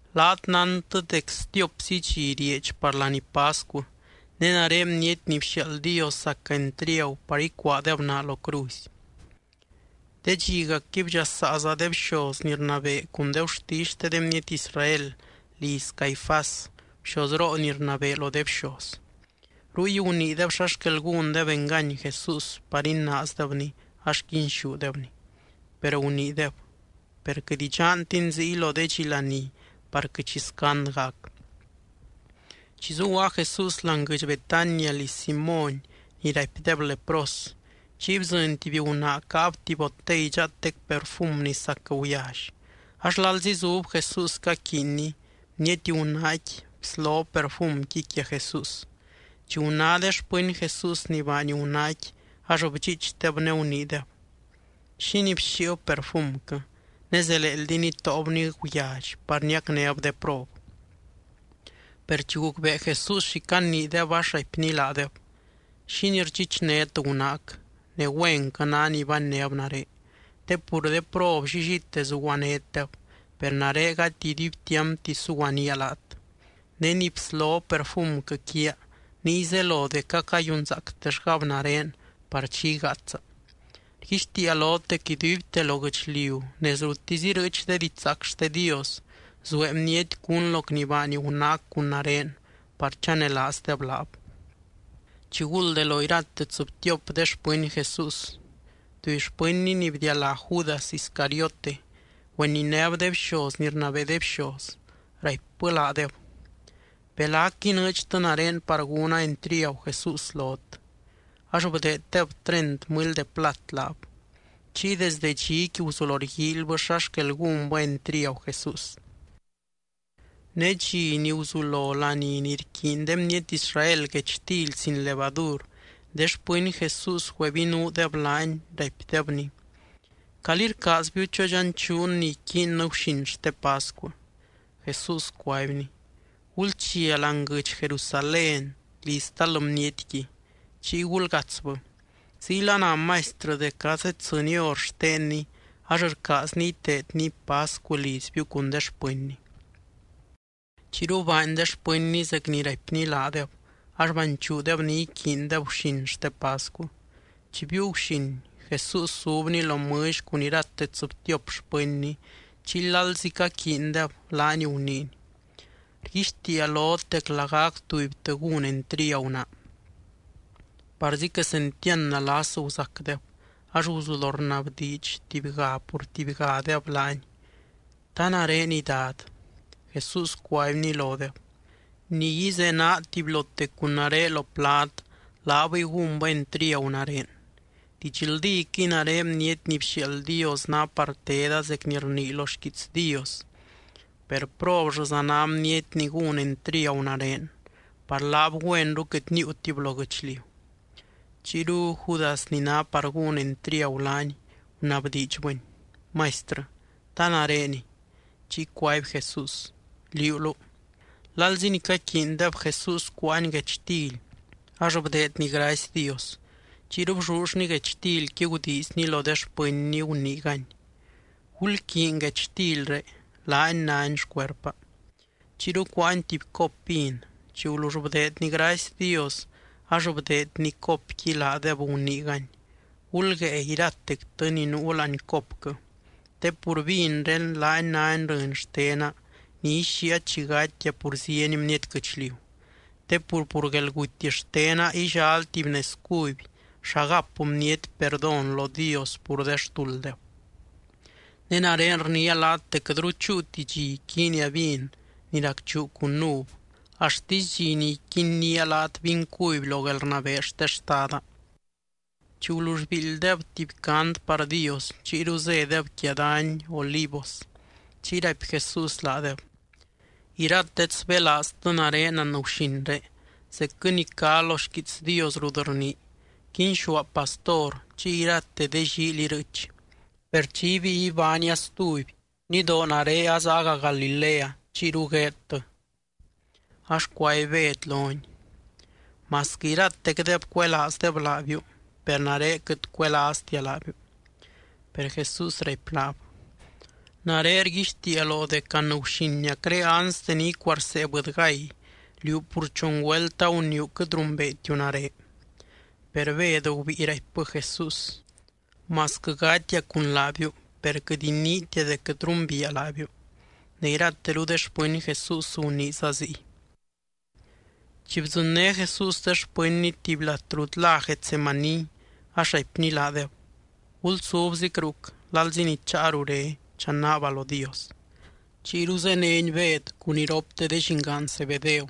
—Laat nántɨ dec stiopzi dxi rieedx par laní pascu, ne nare Bniety ni bxiaald Dios zaca entriagu par icuaadeb naa lo cruzy. De dxigacqui bdxasaaza de bxoz ni rnabee cun de gurtisy xte de bniety Israel liz Caifás, bxozroo ni rnabee lo de bxoz. Ruy guniideb xa xquel gúndeb engany Jesús par inaazdebny, ax quinxúdebny. Per guniideb: —Per quɨt idxantin ziy lo de dxi laní par quɨt xi scand gac. Chi zuguaa Jesús láani guɨdx Betania liz Simóny ni raipdeb lepros, chiy bdzɨny tuby gunaa caab tuby botey dxaatec perfum ni sac guyally. Ax lalzi zub Jesús caquiinny, bniety gunaaqui bslob perfumqui quia Jesús. Chi guná de xpɨny Jesús ni baany gunaaqui, ax bdxiichdeb ne guniideb: —¿Xínii bxíib perfumquɨ?, ne zeleeldi nitóobni guyally par niacnéb de prob. Per chi gucbee Jesús xi caniideb, ax raipny laadeb: —¿Xínii rdxichnét gunaac?, ne güenquɨ ná ni bannéb nare. Te pur de prob llillite zuguanétdeb, per nare gati iduibtiampti suguanía laat. Ne ni bslob perfumquɨ quiaa, niy zelo dec acayunzaactellgab nare par chi igaatsa. Rguixtiia lot dec iduibte lo guɨchliu nez ruttisy irɨɨch de didxzaac xte Dios, zuee bniety cún loc ni baany gunaac cun nare par chanelaazdeb laab. Chiguld de lo irate tsɨbtiop de xpɨny Jesús, tuby xpɨnny ni bdialá Judas Iscariote, güeninéb de bxoz ni rnabee de bxoz, raipbɨ laadeb: —¿Belac inɨɨdxtɨ nare par gúna entriagu Jesús lot? Ax bdeeddeb treint mɨly de plat laab. Chiy desde dxiqui guzulo rguíilybɨ xa xquel gúnbɨ entriagu Jesús. Ne dxi ni guzulo laní ni rquiiny de bniety Israel guechtily sin levadur, de xpɨny Jesús güebinuudeb laany, raipdebny: —¿Calí rcaazbiu chodxanchuun ni iquiinnɨ guxin xte pascu? Jesús cuaibny: —Gulchia láani guɨdx Jerusalén liz tal bnietqui, chiy gulgatsbɨ: Ziyla na Maistrɨ dec azeddzɨny hor xtenny ax rcaazny iteedny pascu lizbiu cun de xpɨnny. Chiyru baany de xpɨnny zec ni raipny laadeb, ax banchuudeb ni iquiindeb guxin xte pascu. Chi biiu guxin, Jesús zubny lo mɨlly cun irate tsɨbtiop xpɨnny. Chiy lalzi caquiindeb, laany guniiny: —Rguixtiia lot dec lagac tubytɨ gún entriagu naa. Parzi quesentiand nalas guzacdeb, ax guzulo rnabdiidx tubyga pur tubygadeb laany: —¿Ta nareniy, Dad? Jesús cuaibny lodeb: —Ni ízenaa tubylote cun nare lo plad, laabɨy gúnbɨ entriagu nare. Didxldíquɨy nare Bniety ni bxiaald Dios ná par teda zec ni rnii lo xquiits Dios. Per, ¡probllɨza ná bniety ni gún entriagu nare! Par laab güenru quɨt níiutib lo guɨchliu. Chiyru Judas ni ná par gún entriagu laany, gunabdiidxbɨny: —Maistrɨ, ¿ta nareniy? Chiy cuaby Jesús: —Liúluu. Lalzi ni caquiindeb, Jesús cuáany guechtily ax bdeedny gracy Dios. Chiyru bllullny guechtilqui gudiizny lo de xpɨnny, guniigany: —Gulquiiny guechtilré, laani náni xcuerpa. Chiyru cuáany tuby cop vin. Chi gulull bdeedny gracy Dios, ax bdeedny copqui laadeb, guniigany: —Gulguée iratectɨ ni nuu láani copquɨ. Te pur vinré, laani náni rɨny xtena ni ixíia chi gatia pur zieny bniety guɨchliu. Te pur, pur guelguty xtena illal tuby nez cuby xa gap bniety perdón lo Dios pur de xtulddeb. Ne nare rniia laat dec quɨtru chúuti dxi iquiinia vin ni racchuu cun uv, axtisy dxi ni iquinnía laat vin cuby lo guelrnabee xte Xtada. Chi gulull biildydeb tuby cant par Dios, chiyru zédeb quia dany Olivos. Chiy raipy Jesús laadeb: —Iratet sbélaaztɨ nare anguxinré, zecquɨ ni cá lo xquiits Dios rut rnii: “Quinxúa pastor, chiy irate de llíily irɨɨch.” Per chi ibíi ibánia stuby, nidoo nare azaaga Galilea chiyru gueedtɨ. Ax cuaby Bed lony: —Masquɨ iratecdeb cuelaazdeb laabiu, per nare quɨt cuelaaztia laabiu. Per Jesús raipy laab: —Nare rguixtiia loo dec anguxiniacré anste ni icuarsee bɨdygay, liú pur chon güelt aguniiu quɨt rumbeetiu nare. Per Bed gubíi raipbɨ Jesús: —Masquɨ gatia cun laabiu, per quɨt iniitia dec quɨt rumbiia laabiu. Ne irateru de xpɨny Jesús guniiza ziy. Chi bdzɨnné Jesús de xpɨnny tuby lat rut lá Getsemaní, ax raipny laadeb: —Gulsubzic ruc, lalzi ni cháa rure chanaaba lo Dios. Chiyru zéneny Bed cun iropte de llingaan Zebedeo,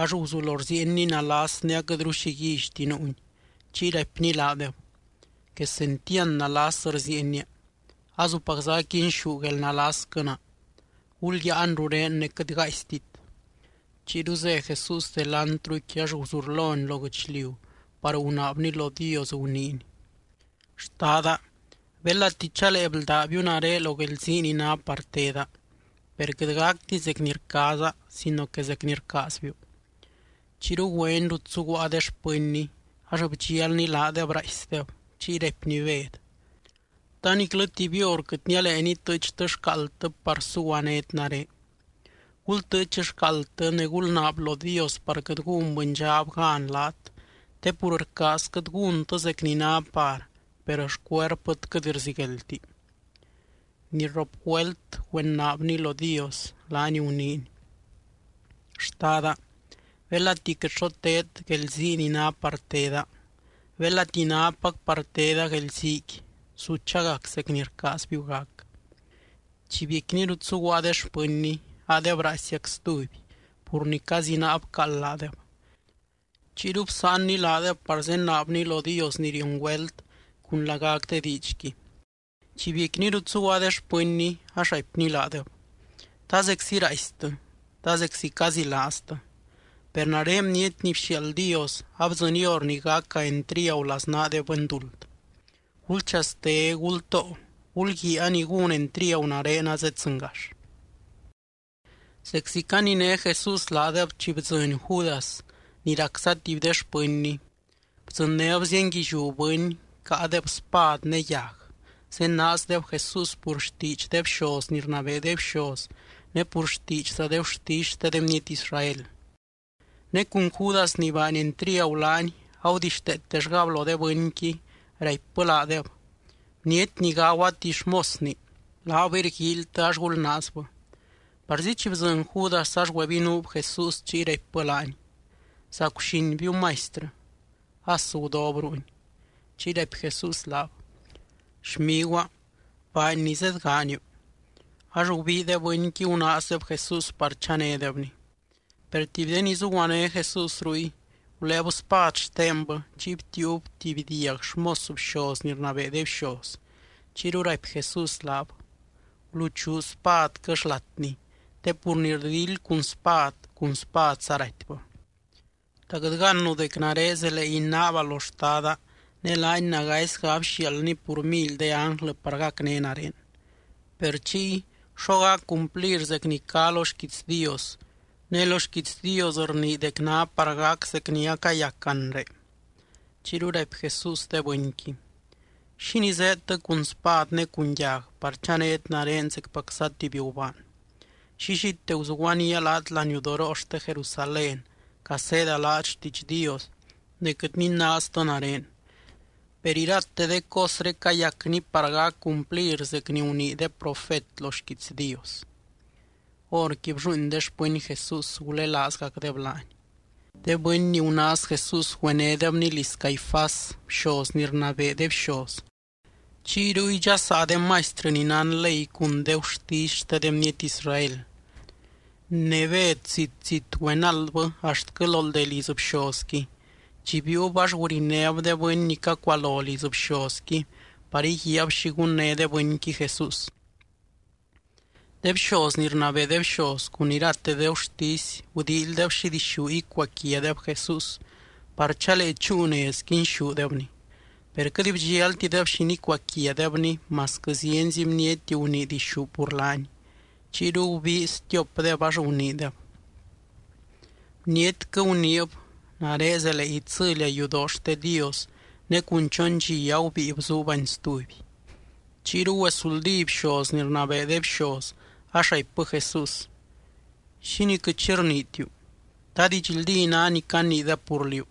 ax guzulo rziienny nalas ne aquɨtru xi guíllyti nuuny. Chiy raipny laadeb: —Quesentiand nalas rziienia. Azupacza aquinxú guelnalasquɨ naa. Gulyáan rurén ne quɨt gaaistit. Chiyru zé Jesús delantruqui, ax guzurlony lo guɨchliu par gunaabny lo Dios, guniiny: —Xtada, belati chalee bldábiu nare lo guelzii ni ná par teda, per quɨt gacti zec ni rcaaza sino que zec ni rcaazbiu. Chiyru güeny rut zuguaa de xpɨnny, ax bdxialny laadeb raaisdeb, chiy raipny Bed: —¿Ta niclɨ tuby hor quɨt nialee nitɨɨchtɨ xcaaldtɨ par zuguanét nare? Gultɨɨch xcaaldtɨ ne gulnaab lo Dios par quɨt gún bɨndxab gan laat. Te pur rcaazquɨt gúntɨ zec ni ná par, per xcuerpɨt quɨt rzigueldti. Ni rrop güelt güenaabny lo Dios, laany guniiny: —Xtada, belati quɨt xo teed guelzii ni ná par teda, belati nápac par teda guelziiqui, su chagac zec ni rcaazbiu gac. Chi biecquiny rut zuguaa de xpɨnny, adeb raaisiac stuby, pur ni cazinaa bcaald laadeb. Chiyru bsáanny laadeb par zenaabny lo Dios ni rion güelt cun lagac de diidxqui. Chi biecquiny rut zuguaa de xpɨnny, ax raipny laadeb: —¿Ta zeczi raaistɨ? ¿Ta zeczi cazilaaztɨ? Per nare Bniety ni bxiaald Dios, abdzɨny hor ni gaca entriagu laznaa de bɨnduld. Gulchaste. Gultoo. Gulguiaa, a ni gún entriagu nare azeddzɨngax. Zeczi caniné Jesús laadeb chi bdzɨny Judas ni racza tuby de xpɨnny. Bdzɨnnéb zienguilliú bɨny, caadeb spad ne yag. Zenaazdeb Jesús pur xtiidx de bxoz ni rnabee de bxoz ne pur xtiidxza de gurtisy xte de bniety Israel. Ne cun Judas ni baany entriagu laany agudixteetellgab lo de bɨnqui, raipbɨ laadeb: “Bniety ni gagua tuby xmosni, laabɨy rguíilytɨ ax gulnaazbɨ.” Parzi chi bdzɨny Judas, ax güebinuub Jesús chiy raipbɨ laany: —¡Zacguxinbiu, Maistrɨ! As gudob ruuny. Chiy raipy Jesús laab: —Xmiguaa, baany ni zedgaaniu. Ax gubii de bɨnqui gunaazdeb Jesús par chanédebny. Per tuby de ni zuguané Jesús ruy, guléeb spad xtenbɨ chiy btiiub tuby diag xmos bxoz ni rnabee de bxoz. Chiyru raipy Jesús laab: —Guluchuu spadquɨ xlatni. Te pur ni rdildy cun spad, cun spadza ratybɨ. ¿Ta quɨt gannu dec nare zelee inaaba lo Xtada, ne laany nagaisga abxiaaldny pur mily de ánglɨ par gacné nare? Per chiy, ¿xo gac cumplir zec ni cá lo xquiits Dios, ne lo xquiits Dios rnii dec ná par gac zec ni acayac anre? Chiyru raipy Jesús de bɨnqui: —¿Xínii zéedtɨ cun spad ne cun yag par chanét nare zecpacza tuby gubaan? Llillite guzuguanía laat laniudoroo xte Jerusalén caseeda laat xtiidx Dios, ne quɨt ninaaztɨ nare. Per irate de cosré cayacni par gac cumplir zec ni gunii de profet lo xquiits Dios. Horqui blluuin de xpɨny Jesús, gulelaazgacdeb laany. De bɨny ni gunaaz Jesús güenédebny liz Caifás, bxoz ni rnabee de bxoz, chiy ruy dxasaa de maistrɨ ni nán ley cun de gurtisy xte de bniety Israel. Ne Bed zit, zit güenaldbɨ axtquɨ lo ldee liz bxozqui. Chi biiub, ax gurinéb de bɨny ni cacualo liz bxozqui par íguiaab xi gunné de bɨnqui Jesús. De bxoz ni rnabee de bxoz cun irate de gurtisy gudíilydeb xi dixú icuaquiadeb Jesús par chalee chúu nez quinxúdebny. Per quɨt bdxialtideb xi nicuaquiadebny masquɨ zienzi bniety gunii dixú pur laany. Chiyru gubii stiopdeb ax guniideb: —Bnietquɨ guniib: “Nare zelee itsɨlia yudoo xte Dios, ne cun chon dxi agubíi bzuubani stuby.” Chiyru güesuldí bxoz ni rnabee de bxoz, ax raipbɨ Jesús: —¿Xínii quɨt xi rniitiu? ¿Ta didxldí ná ni caniideb pur liú?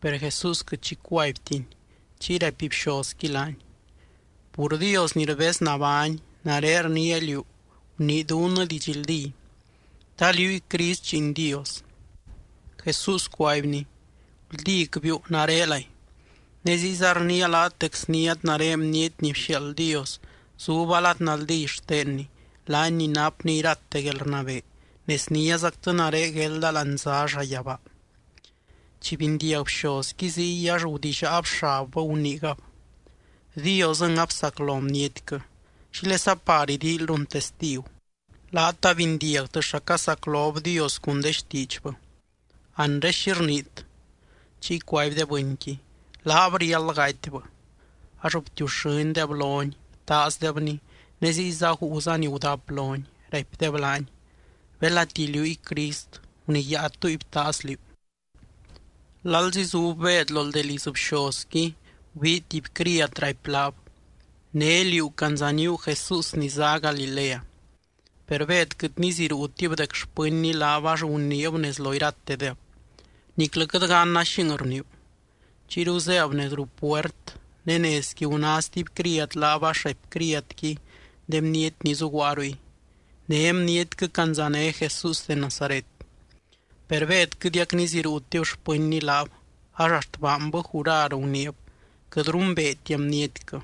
Per Jesús quɨt xi cuaibtiny. Chiy raipy bxozqui laany: —Pur Dios ni rbez nabány, nare rniia liú gunii dunnɨ didxldí, ¿ta liúy Crist Lliin Dios? Jesús cuaibny: —Guldícbiu, narelay. Ne ziyza rniia laat dec sniát nare Bniety ni bxiaald Dios zuba lad naldí xtenny, laany ni napny irate guelrnabee ne sniázactɨ nare guelda láani zá llayabaa. Chi bindiag bxozqui ziy ax gudillaab xabbɨ, guniigab: —Diosɨng absaclo bnietquɨ. ¿Xílesa par idíilyrun testigu? Laat abindiagtɨ xa casaclob Dios cun de xtiidxbɨ. Anre, ¿xi rniit? Chiy cuaby de bɨnqui: —Laab riáld gatybɨ. Ax btiuxɨ́ndeb lony, btaazdebny ne ziyza guuza ni gudap lony, raipdeb laany: —Belati liúy Crist, ¡guniyáa túy btaaz liú! Lalzi zub Bed lo ldee liz bxozqui gubii tuby criad, raipy laab: —Né liú candzaníu Jesús ni zá Galilea. Per Bed quɨt niziruutib dec xpɨnny laab, ax guniib nez lo iratedeb: —Niclɨ quɨt ganna xing rniiu. Chiyru zéb nez ruu puert, ne nezqui guná stuby criad laab ax raipy criadqui de bniety ni zuguaa ruy: —Né bnietquɨ candzané Jesús de Nazaret. Per Bed quɨtiac niziruutib xpɨnny laab, ax axt baanbɨ jurar guniib: —Quɨt rumbeetia bnietquɨ.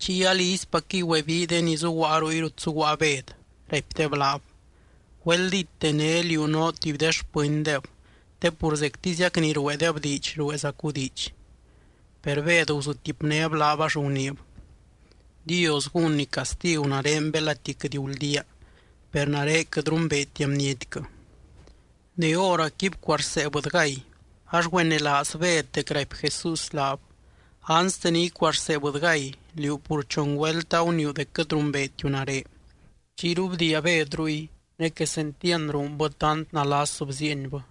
Chiy alizypacquɨy güebii de ni zuguaa ruy rut zuguaa Bed, raipdeb laab: —Güeldíte né liú noo tuby de xpɨndeb, te pur zectiziac ni rueedeb diidx rueezacu diidx. Per Bed guzutipnéb laab ax guniib: —Dios gúnny castigu nare belati quɨt guldía, per nare quɨt rumbeetia bnietquɨ. Ne hóracqui bcuarsee bɨdygay. Ax güenelaaz Bed dec raipy Jesús laab: “Anste ni icuarsee bɨdygay, liú pur chon güelt aguniiu dec quɨt rumbeetiu nare.” Chiyru bdiia Bed ruy ne quesentiand ruunbɨ tant nalas bziienbɨ.